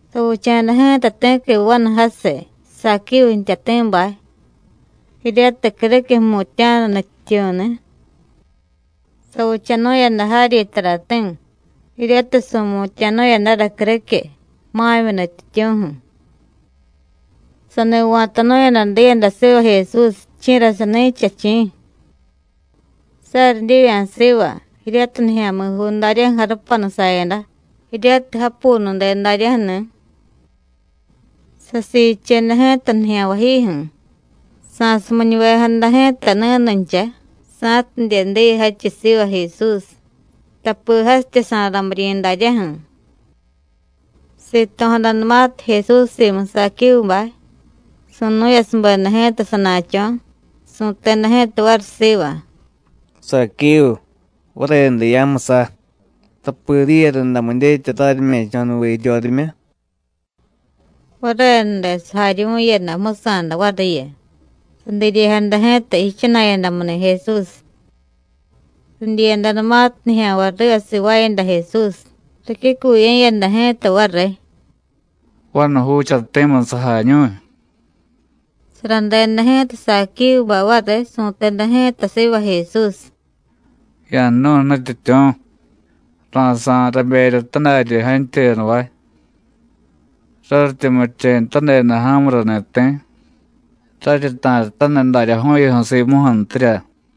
Savicha̱da ji̱ta ti̱qui vanu jasiy, Saquívu jtyati̱bay, jiryatiy criquiy jmutya̱nu nutyityu̱ni̱. Savichanu̱yada jaryi tarati̱, jiryatiy su̱mutya̱nu̱yadara criquiy, ma̱myi nutyityu̱ju̱. Sani va̱tanu̱yada diyada siva Jesús, ¿chi̱ra sani̱cha, chi̱? Saryi divya̱ siva, jiryatiy nijya̱mi̱juu daryaju̱ jarupanu sayada, jiryatiy japunude daryaju̱ni̱. Sasiicheda ji̱ta nijya̱nvayjiju̱, sa̱sumiñuvejada ji̱ta ni̱nuncha, sa̱tidye diy jadchiy siva Jesús, tapi jasitya sa̱ramiryi̱ daryaju̱. Sito̱jadanumatiy Jesús simu Saquívubay, su̱nu̱yasubeda ji̱ta sana̱cho̱, su̱teda ji̱ta variy siva: “Saquívu, varenude ya̱jmusa, tapi diye rundamu dyetya raryime̱cho̱nuve jiryorimyu.” Varenude sajaryuvu̱yada jmusa̱da variyu, sadiryejada ji̱ta jichana̱yadamuni̱ Jesús. Ridyiyadanumatiy nijya̱nvay riva sivaayada Jesús, ricyucuye̱yada ji̱ta variy: “Vanu juuchati̱mu sajañu̱y.” Saradeda ji̱ta Saquívubay variy, su̱teda ji̱ta siva Jesús: “Ya̱jnu̱y, Nutyityu̱, ra̱sa̱y raberya tadaryi jantyuyadavay; raryityi murichenutadeda ja̱murani̱ ti̱, raryi ta̱ryataniy daryaju̱yuju̱ simuju̱ntirya.”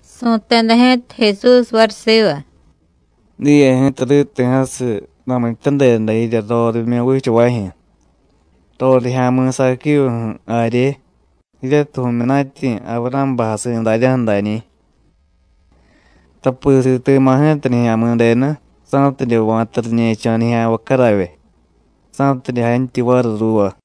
Su̱teda ji̱ta Jesús variy siva: “Diye ji̱ta riti̱jasiy ramityadeda jirya rorimyu vichavajyu̱, rorijya̱mi̱ Saquívuju̱ jarye, jiryatiy vu̱myunatyi̱ Avurá̱bay jasi̱ daryaju̱ dañi̱. Tapi siti̱ma̱ ji̱ta Nijya̱mi̱denu, sa̱tidye va̱ta riñe̱cho̱ nijya̱nvay caravye, sa̱tidye jantyuy variy ruuva.”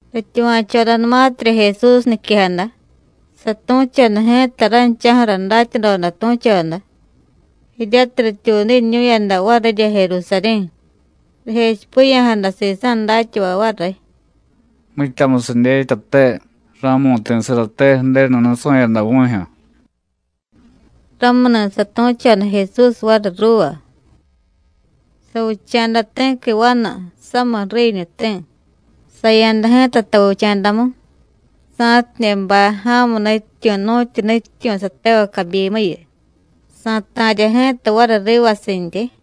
Rityuva̱chodanumatirya Jesús niquejada, satu̱choda ji̱ta ranchaju̱ra datyadoda tu̱choda, jiryatiy rityuudiñu̱yada varirya Jerusarí̱, rijechipiya̱jada sisa̱ datyavay variy: “Mityamusiy dyetyate ra̱mu̱ti̱sarate Ju̱denu nusu̱yada vu̱jyu̱.” Ramuni̱ satu̱choda Jesús variy ruuva: “Savicha̱da ti̱qui vanu, samiy jriiñuti̱, saya̱da ji̱ta tavicha̱damu, sa̱tidye bay ja̱mu nutyityu̱ nu̱tyu nutyityu̱ satevay cabyimuyu, sa̱ta̱rya ji̱ta variy rivasintyi.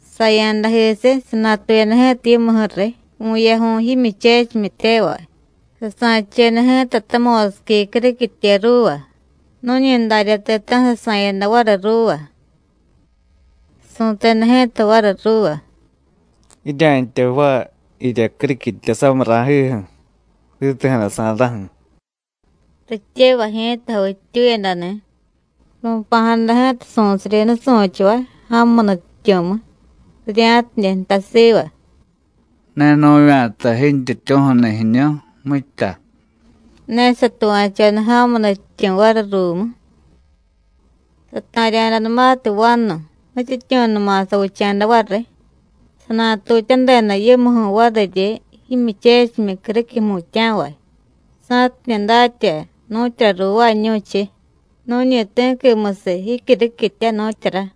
Saya̱dajisiy, sanatuyada ji̱ta yimuju̱riy vu̱yaju̱y jimyuchechimyityevay, sasa̱cheda ji̱ta tamo̱siqui criquitye ruuva, nu̱ñi darya ti̱ta̱ju̱ sasa̱yada variy ruuva. Su̱teda ji̱ta variy ruuva: Jirya̱ntya jvaay jirya criquitya samiy ra̱jiju̱, riti̱jada sa̱ra̱ju̱. Rityevay ji̱ta javittyuyadani̱, ru̱pa̱jada ji̱ta su̱siryi nusu̱chavay, ja̱mu nutyityu̱mu, rirya̱tidye jtay siva: Ne nu̱vya̱ta jintyityu̱ju̱ni̱ jiñu, mitya. Ne satuva̱choda ja̱mu nutyityu̱ variy ruumu. Sata̱rya̱danumatiy vanu, nutyityu̱numa savicha̱da variy. Sanatutyadeda yimuju̱ variryi jimyuchechimyi criquiy jmutya̱vay, sa̱tidye datya nu̱tyura ruuvaañu̱chiy nu̱ñi ti̱quimusiy jicyuriquitya, nu̱tyura.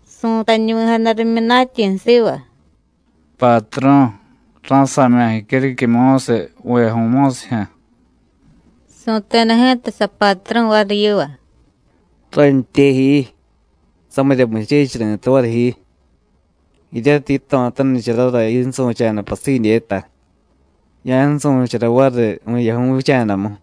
Su̱tañuvi̱jada rimyunatyi̱ siva: Patru̱, rá̱sa̱mya̱ jicyuriquiy mo̱siy vu̱yaju̱y mo̱sijyu̱. Su̱teda ji̱ta sapatru̱ variy yiva: ¡Rántyé ji, samirya muchechiy ri̱tay variy ji! Jiryatiy yito̱tanicharara yinsu̱cha̱da pasidyeta, ya̱nsu̱chara variy vu̱yaju̱y vicha̱damu.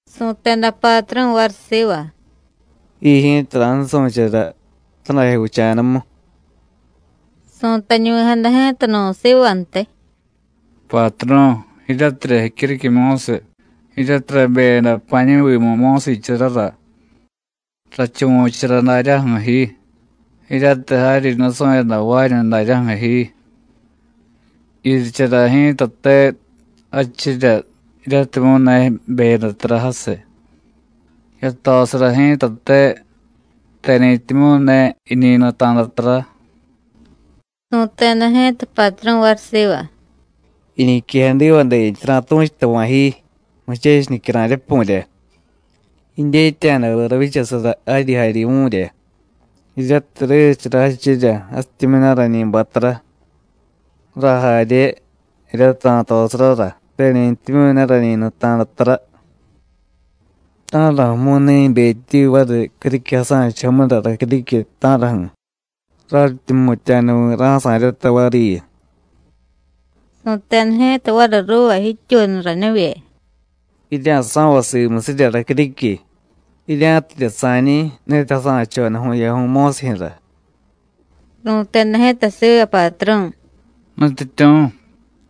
Su̱teda patru̱ variy siva: Ji ji̱ta ra̱nsu̱chara tadajyo vicha̱damu. Su̱tañuvi̱jada ji̱ta nu̱ sivantiy: Patru̱, jiryatirya jicyuriquiy mo̱siy, jiryatiy rabeyada pa̱a̱ñi̱vimu mo̱siicharara. Rachuvu̱chara daryaju̱ ji, jiryatiy jaryi nusu̱yadajvaañu daryaju̱ ji. Yirichara ji̱tate jadchirya, jiryatimyu̱ ne jibeyada tara jasiy; yatosara ji̱tate, teni̱ntimyu̱ ne jiñi nuta̱da tara. Su̱teda ji̱ta patru̱ variy siva: ¡Jiñiquejadivadentya ra̱tu̱chutava̱ ji, muchechiy nicyara̱y rapu̱rya! Jidyetya̱da viy ravyichasara jaryi jaryuvu̱rya, jiryatiy ririchara jadchirya, jasityimyu̱ ne rañi bay tara, rajarye, jiryatiy ra̱tosarara teni̱ntimyu̱ ne rañi nuta̱da tara. ¿Ta̱raju̱mu̱y ne jibetyi variy criquiy jasa̱chujomura racyuriquiy, ta̱raju̱? raryityi jmutya̱nuvi̱ ra̱sa̱ryata variyu. Su̱teda ji̱ta variy ruuva jityuunu ranivye: Jirya̱so̱vay simusirya racyuriquiy, jirya̱tidye sa̱ñi̱ ni̱tiy jasa̱choda vu̱yaju̱y mo̱sijyu̱ra. (Ru̱teda ji̱ta siva patru̱, ¡Nutyityu̱,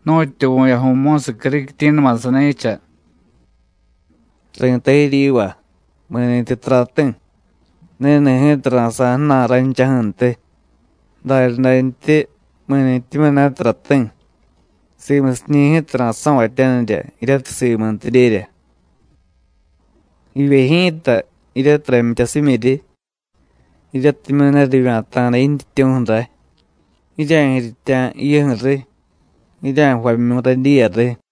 nu̱tyu vu̱yaju̱y mo̱siy criquityi̱numa sani̱cha!) Ri̱tay jiryiva: Mi̱ni̱tyi tarati̱, ni̱ni̱ ji̱ta ra̱sa̱y ju̱na̱y ranchaju̱ntiy; daryadantyi, mi̱ni̱tyimyu̱ ne tarati̱, simusiñi̱ ji̱ta ra̱so̱vatyanirya jiryatiy simuntidyerya. Jivye ji̱ta, jiryatiy ramyityasimyiryi, jiryatimyu̱ ne rivya̱ta̱da jintyityu̱ju̱ ray, ¡jirya̱jiryitya̱ jiyuju̱ riy, jirya̱jvamyu̱y radyiya riy!”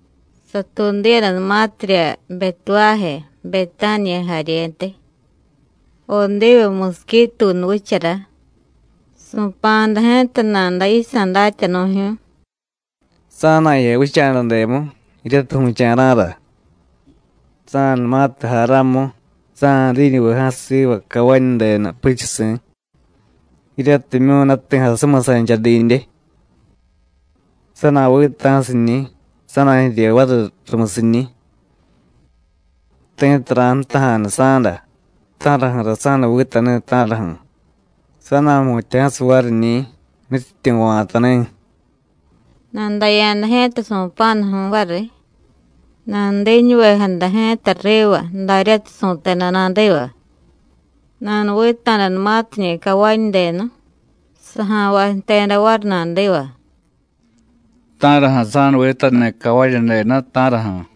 Satuudiyadanumatirya Betuváje, Betániya jaryentiy, Odivu musiquituunu vichara, su̱pa̱jada ji̱ta nada yisa̱ datyanu̱jyu̱y: “Sa̱na̱jiya vicha̱dademu, jiryatiy vu̱cha̱ra̱ra. Sa̱na̱numatiy jay ramu, sa̱na̱diñuve jasiy siva cavañudenu puchusi̱, jiryatimyu̱ ne ti̱ jasumiy sancha didye. Sa̱na̱vita̱siñi̱, sa̱na̱jirye variy rumusiñi̱. Ti̱tiy ra̱jtaja̱nu sa̱da: ¿Ta̱raju̱ra sa̱nuvitani̱, ta̱raju̱? sa̱na̱jmutya̱jasiy variñi̱: Nutyityu̱ va̱tani̱.” Nadaya̱da ji̱ta su̱pa̱nuju̱y variy, nanudiñuvejada ji̱ta riva, daryatiy su̱teda nadiva. Nanuvita̱danumatiñi̱ cavañudenu, saja̱nvay jteda variy nadiva: “¿Ta̱raju̱ sa̱nuvitani̱ cavañudenu, ta̱raju̱?”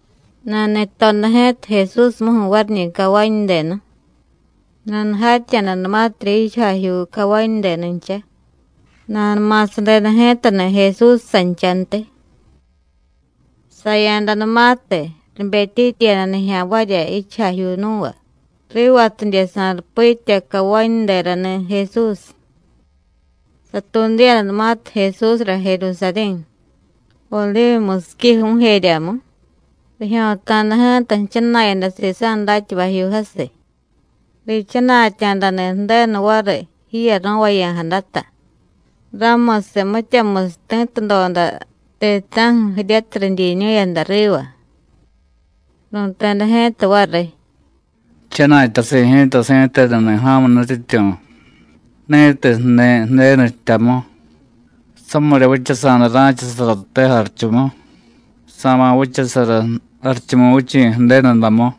Nani̱toda ji̱ta Jesúsmuju̱ variñi̱ cavañudenu. Nanujatya̱danumatirya jichujajyuu cavañudenuncha, nanuma̱sadeda ji̱tani̱ Jesús sanchantiy. Saya̱danumatiy, ribetyityiyada nijya̱nvarya jichujajyuu nú̱va, rivatidye sa̱rupitya cavañuderani̱ Jesús. Satuudiyadanumatiy Jesúsra Jerusarí̱, Odivu musiqui ju̱u̱jeryamu, rijyo̱ta̱da ji̱ta jchana̱yada sisa̱ datyavajyuu jasiy, riichana̱tya̱dani̱ Ju̱denu variy jiyaro̱vaya̱jadata, ramusiy mityamusiy ti̱tudoda ti̱ta̱ju̱ jiryatiy ridyiñu̱yada riva. Ru̱teda ji̱ta variy: “¡Jchana̱tyasi̱ ji̱ta si̱tenuni̱ ja̱mu nutyityu̱, ni̱tiy jniy Ju̱denu jtyamu! ¡Samirya vichasa̱da ra̱chasaraté jarichumu, sa̱ma̱ vichasara Jarichumuvichi̱ Ju̱denudamu!”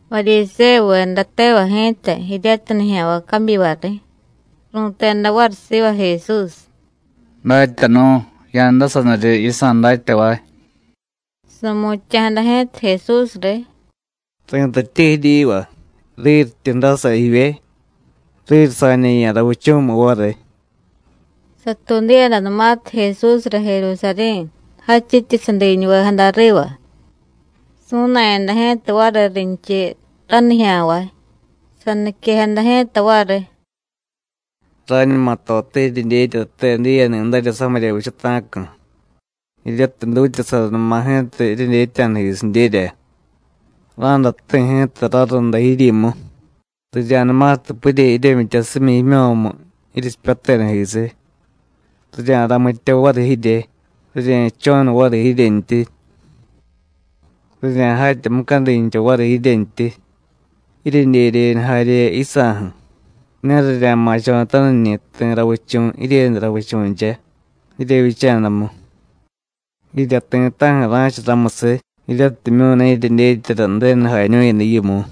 Varyisévuveda tevay ji̱ta, jiryatiy nijya̱nvay cabyivariy, ru̱teda variy siva Jesús: “¡Datyanu̱, ya̱ndasaniryi yisa̱ datyavay!” Su̱mutya̱jada ji̱ta Jesús riy: “Ri̱tatye jiryiva, riryityi dasa jivye, riryi sa̱ñe̱ya̱ ravichu̱miy variy.” Satuudiyadanumatiy Jesúsra Jerusarí̱, jadchityi sadiñuvejada riva, su̱na̱yada ji̱ta variy rinchiy ranijya̱nvay. Saniquejada ji̱ta variy: “Rañuma tote jiryedyetyate diyeni̱darya samirya vichata̱cu̱, jiryatiy dutyasaranuma ji̱ta jiryedyetya̱dajisidyerya. Ra̱day jti̱ ji̱ta rarunda jiryimu, rirya̱numatiy purye jiryemyityasimyi jimyo̱mu jiryechipyatedajisiy, rirya̱ramitya variy jirye, rirye̱jcho̱nu variy jiryentyi. Rirya̱jatya mucadincha variy jiryentyi, jiryedyedyeñu jarye yisa̱ju̱, ne rirya̱ma̱cho̱taniñi̱ ti̱ ravichu̱ jiryenu ravichu̱ncha, jiryevyicha̱damu. Jirya ti̱ta̱ju̱ ra̱cha ramusiy, jiryatimyu̱ ne jiryedyetyara Ju̱denu jañu̱yada yimu.”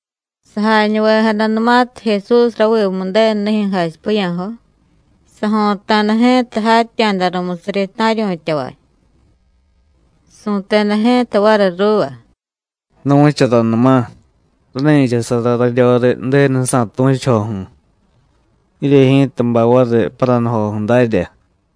Sajañuvejadanumatiy Jesús ravimu Ju̱denunijyu̱ jachipiya̱jo, sajo̱ta̱da ji̱ta jatya̱da rumusiryi ta̱ryu̱tyavay. Su̱teda ji̱ta variy ruuva: “Nu̱charanuma: Rani̱chasara raryoriy Ju̱denusa̱ tu̱chujoju̱, jirye ji̱ta bay variy paranujoju̱ dárya.”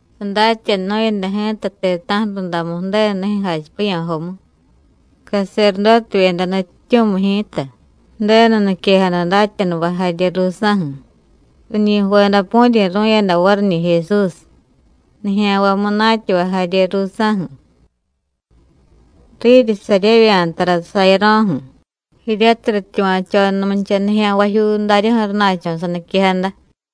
Sadatyanunu̱yada ji̱ta ti̱ta̱ju̱ rundamu Ju̱denunijyu̱ jachipiya̱jomu. Caserdótevyeda nutyityu̱miy ji̱ta, Ju̱denu niquejada datyanuvay jarye ruusa̱ju̱, riñi jvedapu̱ryi̱ru̱yada variñi̱ Jesús, nijya̱nvay munatyavay jarye ruusa̱ju̱. Riryi saryevya̱ tara sayaro̱ju̱, jiryatiy rityuva̱chonumucha nijya̱nvajyuu daryaju̱ rana̱cho̱ saniquejada.